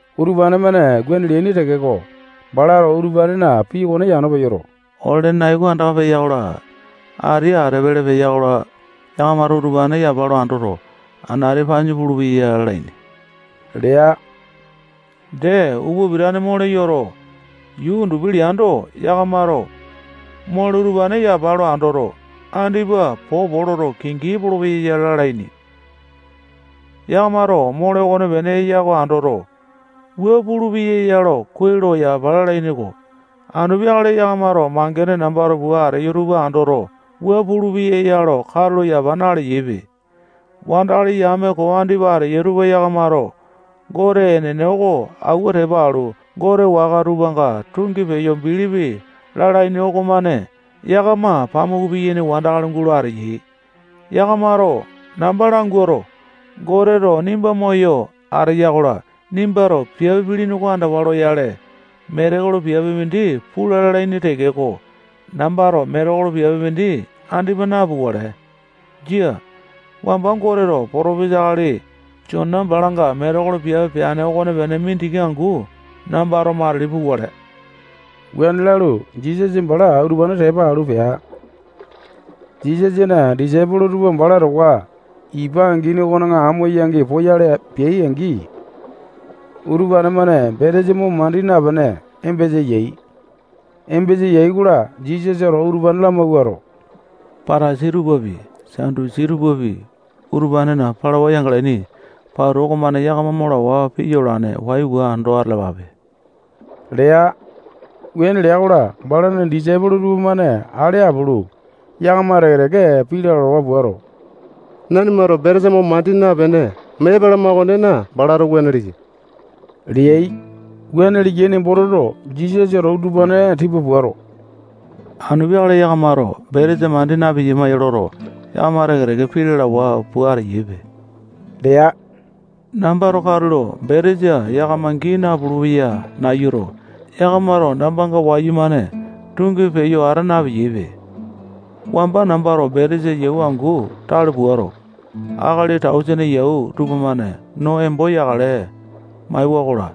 [Utupane-mane wuane leaini tekeko, balato utupanena pii okone yano peyoto, ole-lene nai oko andaka peya-kola, ati ate pele peya-kola, yakamato utupane yapa lo andoto, anati panyu pulupeya ya lalaini lea. Dee, upa pitane, mole yoto, yuu undupi leando, yakamato mole utupane yapa lo andoto, andipa popo loto, kingi epolopeya ya lalaini. Yakamato mole okonepene eya oko andoto, wua pulupeya ya lo kuai lo yapa lalaini-ko. Anu peakale yakamato mangene nambato pua ateyo tupa andoto, wua pulupeya ya lo katulo yapa naleyaipe.] Wandakali yame koo andipa ateyai tupa yakamato Gote enene oko awua tepa alu, gote waka tupanga tungi peyo bilipi lalaini okomane yakama pamuku piyaini wandakali gulo ateyai. Yakamato namba languato, Goteto nimba moyo ateya-kola, nimbato piape pilini oko andawa loyale, metekolo piape mindi pula lalaini tekeko, nambato metekolo piape mindi andipa napukale. Jia. Wamba Goteto potopesa akali Jona balanga metekolo piape peane okonepene mindiki angu nambato matili pukale. Wuane lalu, Jisasa bala utupane tepa alu pea. Jisasana disaipolo tupa bala towa ipa angini okona amo-yangi poyale peai-angi, utupane-mane betesa mo mandi napene, embesa yai. Embasa yai-kola, Jisasato utupane lamawuato, Patasai tupapi, Satusi tupapi, utupanena palawa yangalaini pauta okomane yakama mo lawa piya olane. Waiwa ando atalapape lea. Wuane lea-kola, balana disaipolo tupamane ale apulu, yakama teke-teke pii lalawa puato, nanimato betesa mo mandi napene, mee epalama okonena, balato wuane leya leai. Wuane leyai nembo toto, Jisasato utupane tipa puato, anu peakale yakamato betesa mandi na-piyama loto, yakama teke-teke pii lalawa pua ateyaipe lea. Nambato katulo betesa yakama gii napulu-peya nayuto, yakamato nambanga wayumane tungi peyo ata napeyaipe. Wamba nambato betesa yau angu tale puato, akali tausene yau tupamane no embo yakale maewa-kola,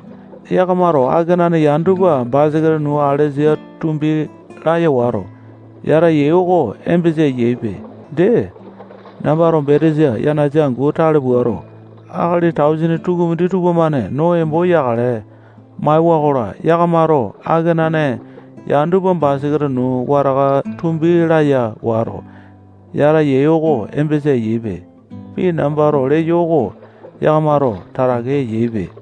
yakamato akenane yane tupa basaketa nuu alesa tumbi laya wato, yata yai oko embesa eyaipe. Dee, nambato betesa yanasa angu tale puato, akali tausene tukumindi tupamane no embo yakale maewa-kola, yakamato akenane yane tupa basaketa nuu wataka tumbi laya wato, yata yai oko embesa eyaipe. Pii nambato leyo oko yakamato tatake eyaipe.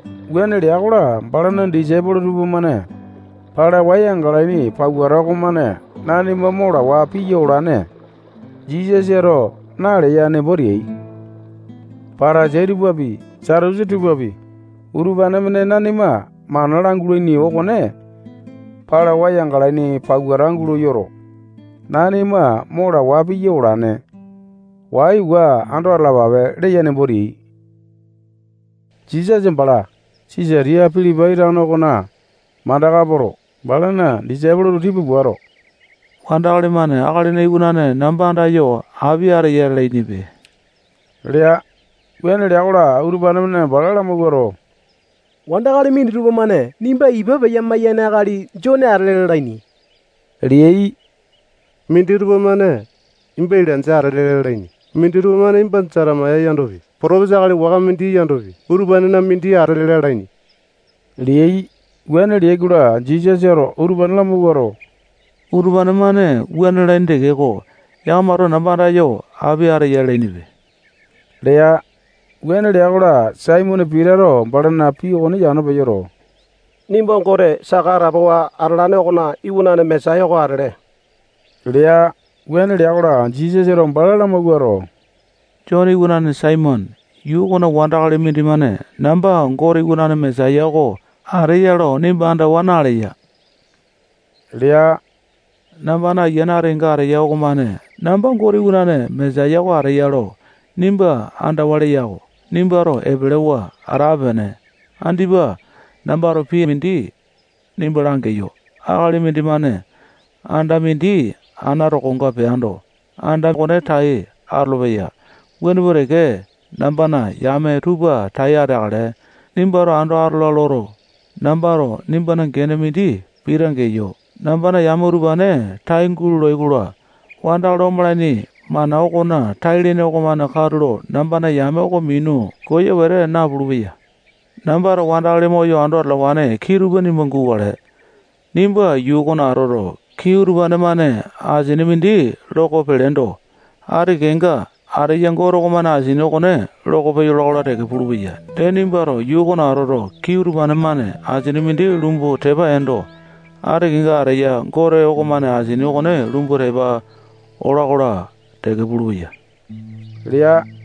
Wuane lea-kola, balana disaipolo tupamane palawa yangalaini pauta okomane nanima mo lawa piya olane Jisasato naleya nembo teai. Patasai tupapi, Satusi tupapi, utupane-mane nanima mana langulai okone palawa yangalaini pauta gulo yoto, nanima mo lawa piya olane. Waiwa ando atalapape leya nembo teai. Jisasa bala Sisatiya Pilipai tano okona mandaka poto, balana disaipolo tupa tipa puato, wandakali-mane Akalina Iwanane namba andayo api ateya lalainipe lea. Wuane lea-kola, utupane-mane bala lamawuato, wandakali minditupa-mane nimba ipa peya-maiyane akali Jone atele lalaini leai. Minditupa-mane nimba Ilainja atele lalaini. Minditupa-mane nimba Jetemaya yandopi, potopesa akali waka mindi yandopi, utupanena mindi atele lalaini leai. Wuane leai-kola, Jisasato utupane lamawuato, utupane-mane wuane lalaini tekeko, yakamato namba andayo api ateya lalainipe lea. Wuane lea-kola, Saimone Pitato balana pii okone yano peyoto, nimba Gote saka atapowa atalane okona Iwanane Mesaya oko atele lea. Wuane lea-kola, Jisasato bala lamawuato, Jone iwanane Saimone, yuu okona wandakali mindimane namba Gote Iwanane Mesaya oko ateya lo nimba andawa naleya lea. Nambana Ayiane ati kenga ateya okomane namba Gote Iwanane Mesaya oko ateya lo nimba andawa langeya-ko. Nimbato epelewa atape-pene. Andipa nambato pii mindi nimba langeyo. Akali mindimane anda mindi ana tokonga peando, anda okone tai atolopeya. Wuane pua teke, nambana yame tupa tai ateakale, nimbato ando atola loto, nambato nimbana gene mindi Pita geyo. Nambana yame utupane tai gulolai-kola, wandakali omalaini mana okona tai-lene okomane katulo nambana yame oko minu koya wete napulu-peya. Nambato wandakali moyo ando atalawane kii tupa nimba gukale. Nimba yuu okona atoto, kii utupane-mane asini mindi loko peleendo, ati kenga ateya Gote okomane asini okone loko peyola-kola teke pulupeya. Dee, nimbato yuu okona atoto, kii utupane-mane asini mindi lumbu tepa eendo, ati kenga ateya Gote okomane asini okone lumbu tepa olo-kola teke pulupeya lea.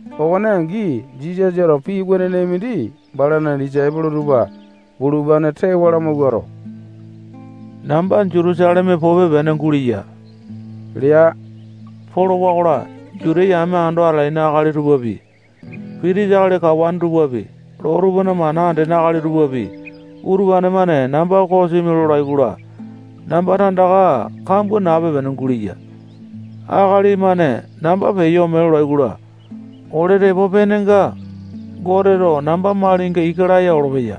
Okone angi, Jisasato pii wenene mindi balana disaipolo tupa bulupane tewa lamawuato, namba Jutusaleme pupe-pene guleya lea. Polowa-kola, Juta yame ando atalaini akali tupapi, pitisa akali kawane tupapi, loo tupana mana andene akali tupapi, utupane-mane namba kosimi lolai-kola, namba tandaka kambua nape-pene guleya. Akali-mane namba peyo ome lolai-kola, ole tepo penenga, Goteto namba malinga ika laya olopeya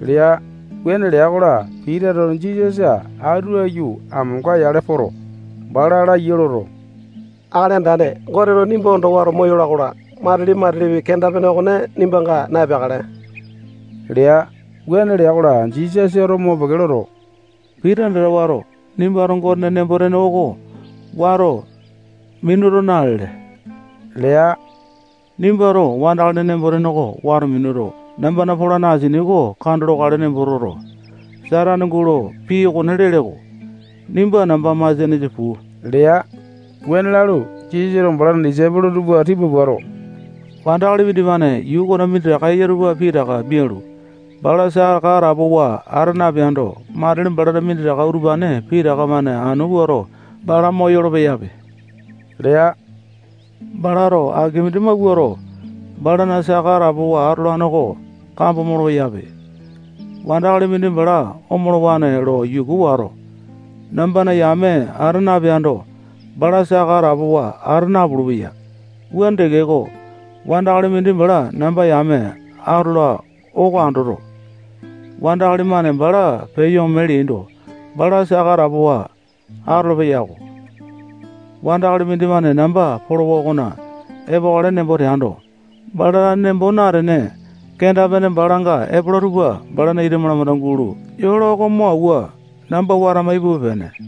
lea. Wuane lea-kola, Pitato Jisasa atu aiyu amonga yale poto, bala laiya loto, Akali Andane, Goteto nimba ondo wato moyola-kola, matili-matilipi kenda-pene okone nimbanga na-epeakale lea. Wuane lea-kola, Jisasato mopeke loto, Pita andata wato, nimbato Gotena nembo-tene oko wato minuto nalele lea. Nimbato wandakalina nembo-tene wato minuto, nambana polane asini oko kando lokale nembo toto, Satane gulo pii okone lele-ko. Nimba nambana masianesa puu lea. Wuane lalu, Jisasato balana disaipolo tupa tipa puato, wandakali mindimane yuu okona minditaka eya tupa pitaka mialu, bala saka atapowa ata napeando, matili balana minditaka utupane pitaka-mane anu puato bala moyolo-peyape lea. Balato aki mindi mawuato, balana saka atapowa atolane oko kambo molo-peyape. Wandakali mindi bala omolowane lo yuku wato, nambana yame ata napeando, bala saka atapowa ata napulu-peya. Wuane tekeko, wandakali mindi bala namba yame atola oko andoto, wandakali-mane bala peyo ome leaindo, bala saka atapowa atolo-peyako. Wandakali mindimane namba polowa okona epokale nembo teando, bala tane nembo natene, kenda-pene balanga epola tupa balana ita malamanda gulo yola oko mo awua, namba watama ipupe-pene.